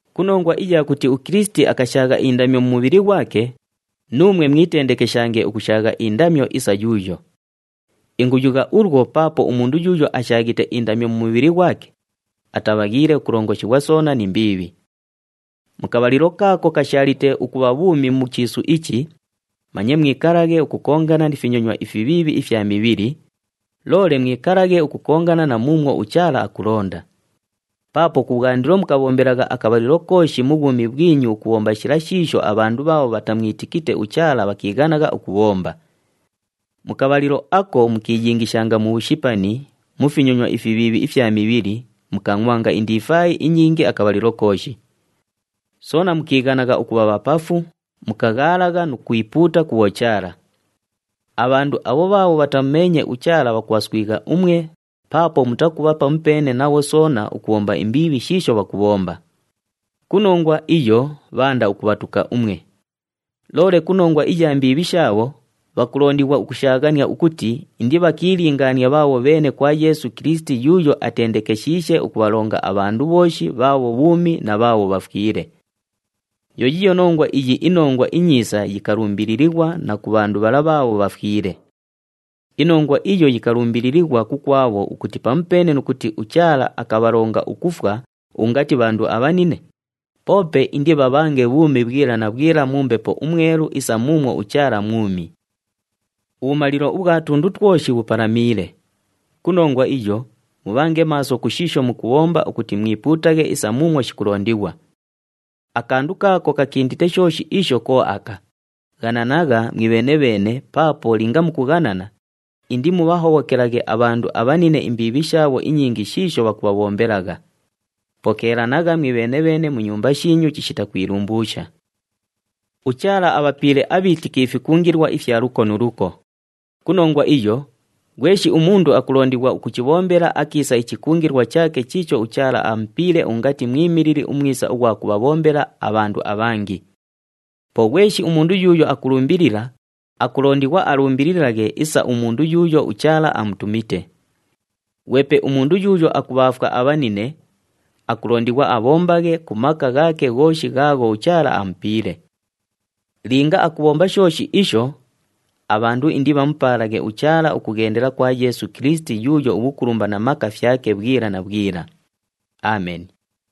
Ku nongwa iya kuti uKilisiti akashaagha indamyo mu mubhili ghwake, nuumwe mwitendekeshange ukushaagha indamyo isa yuuyo. Inguyugha ulwo paapo umundu yuuyo ashaaghite indamyo mu mubhili ghwake, atabhaghiile ukulongoshighwa soona ni mbiibhi. Mu kabhalilo kaako kashaalite ukubha bhuumi mu chiisu ichi, manye mwikalaghe ukukongana ni finyonywa ifibhiibhi ifya mibhili, loole mwikalaghe ukukongana na muumwo uChaala akulonda. Paapo kubhwandilo mukabhombelagha akabhalilo kooshi mu bhwumi bhwinyu ukubhomba shila shiisho abhandu bhaabho bhatamwitikite uChaala bhakiighanagha ukubhomba. Mu kabhalilo ako mukiiyingishanga mu bhushipani, mu finyonywa ifibhiibhi ifya mibhili, mukangʼwanga indifaayi inyingi akabhalilo kooshi. Soona mukiighanagha ukubha bhapafu, mukaghaalagha nu kwipuuta ku bhochaala. Abhandu abho bhaabho bhatamumeenye uChaala bhakubhaswigha umwe paapo mutakubha pamupeene nabho soona ukubhomba imbiibhi shiisho bhakubhomba. Ku nongwa iyo bhaanda ukubhatuka umwe. Loole ku nongwa iya mbiibhi shaabho, bhakulondighwa ukushaaghania ukuti indibhakiilingaanie bhaabho bheene kwa Yeesu Kilisiti yuuyo atendekeshiishe ukubhalonga abhandu bhooshi bhaabho bhuumi na bhaabho bhafwile. Yo yiiyo nongwa iyi iNongwa iNyiisa yikalumbililighwa na ku bhandu bhala bhaabho bhafwile. Inongwa iyo yikalumbililighwa kukwabho ukuti pamupeene nu kuti uChaala akabhalonga ukufwa ungati bhandu abhanine, poope indibhabhange bhuumi bhwila na bhwila mu Mbepo uMwelu isa muumwo uChaala mwumi. Ubhumalilo ubhwa tundu twoshi bhupalamiile. Ku nongwa iyo, mubhange maaso ku shiisho mukubhomba ukuti mwipuutaghe isa muumwo shikulondighwa. Akandu kaako kakindite shooshi isho ko aka, ghananagha mwibheene-bheene paapo linga mukughanana, indimubhahobhokelaghe abhandu abhanine imbiibhi shaabho inyingi shiisho bhakubhabhombelagha. Pokeelanagha mwibheene-bheene mu nyumba shiinyu chishita kwilumbuusha. UChaala abhapiile abhiitiki ifikungilwa ifya luko nu luko. Ku nongwa iyo, ghweshi umundu akulondighwa ukuchibhombela akiisa ichikungilwa chaake chiicho uChaala amupiile ungati mwimilili umwisa ughwa kubhabhombela abhandu abhangi. Po ghweshi umundu yuuyo akulumbilila, akulondighwa alumbililaghe isa umundu yuuyo uChaala amutumite. Ghwepe umundu yuuyo akubhaafwa abhanine, akulondighwa abhombaghe ku maka ghaake ghooshi ghaagho uChaala amupiile. Linga akubhomba shooshi isho, abhandu indibhamupaalaghe uChaala ukughendela kwa Yeesu Kilisiti yuuyo ubhukulumba na maka fyake bhwila na bhwila. Ameni.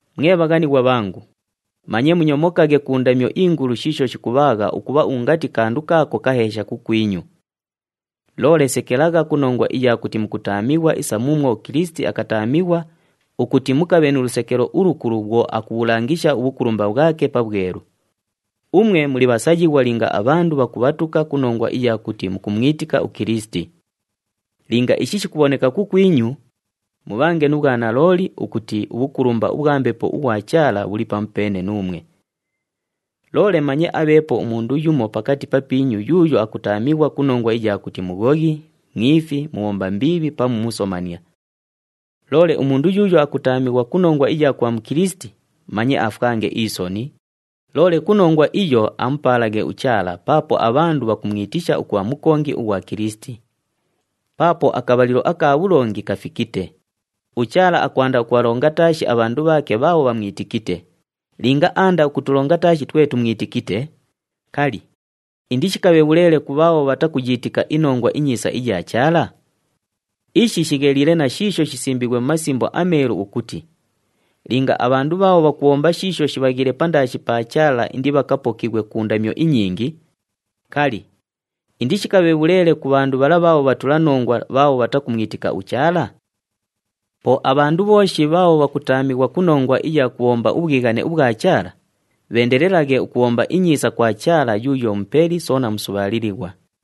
Mwe bhaghanighwa bhangu, manye munyomokaghe ku ndamyo ingulu shiisho shikubhaagha ukubha ungati kandu kaako kaheesha kukwinyu. Loole sekelagha ku nongwa iya kuti mukutaamighwa isa muumwo uKilisiti akataamighwa ukuti mukabhe nu lusekelo ulukulu bhwo akubhulangisha ubhukulumba bhwake pabhwelu. Umwe muli bhasayighwa linga abhandu bhakubhatuka ku nongwa iya kuti mukumwitika uKilisiti. Linga ishi shikubhoneka kukwinyu, mubhange nu bhwanalooli ukuti ubhukulumba ubhwa Mbepo ughwa Chaala bhuli pamupeene nuumwe. Loole manye abheepo umundu yumo pakati papiinyu yuuyo akutaamighwa ku nongwa iya kuti mughoghi, mwifi, mubhomba mbiibhi pamu musomania. Loole umundu yuuyo akutaamighwa ku nongwa iya kubha Mukilisiti, manye afwange isoni, loole ku nongwa iyo amupaalaghe uChaala paapo abhandu bhakumwitisha ukubha mukongi ughwa Kilisiti. Paapo akabhalilo aka bhulongi kafikite, uChaala akwanda ukubhalonga taashi abhandu bhaake bhaabho bhamwitikite, linga aanda ukutulonga taashi twe tumwitikite, kali, indishikabhe bhuleele ku bhaabho bhatakuyiitika iNongwa iNyiisa iya Chaala? Ishi shigheliile na shiisho shisimbiighwe mu Masimbo aMeelu ukuti, “Linga abhandu bhaabho bhakubhomba shiisho shibhaghiile pandaashi pa Chaala indibhakapokighwe ku ndamyo inyingi, kali, indishikabhe bhuleele ku bhandu bhala bhaabho bhatulanongwa bhaabho bhatakumwitika uChaala?” Po abhandu bhooshi bhaabho bhakutaamighwa ku nongwa iya kubhomba ubhwighane ubhwa Chaala, bheendelelaghe ukubhomba inyiisa kwa Chaala yuuyo Mupeli soona musubhaalilighwa.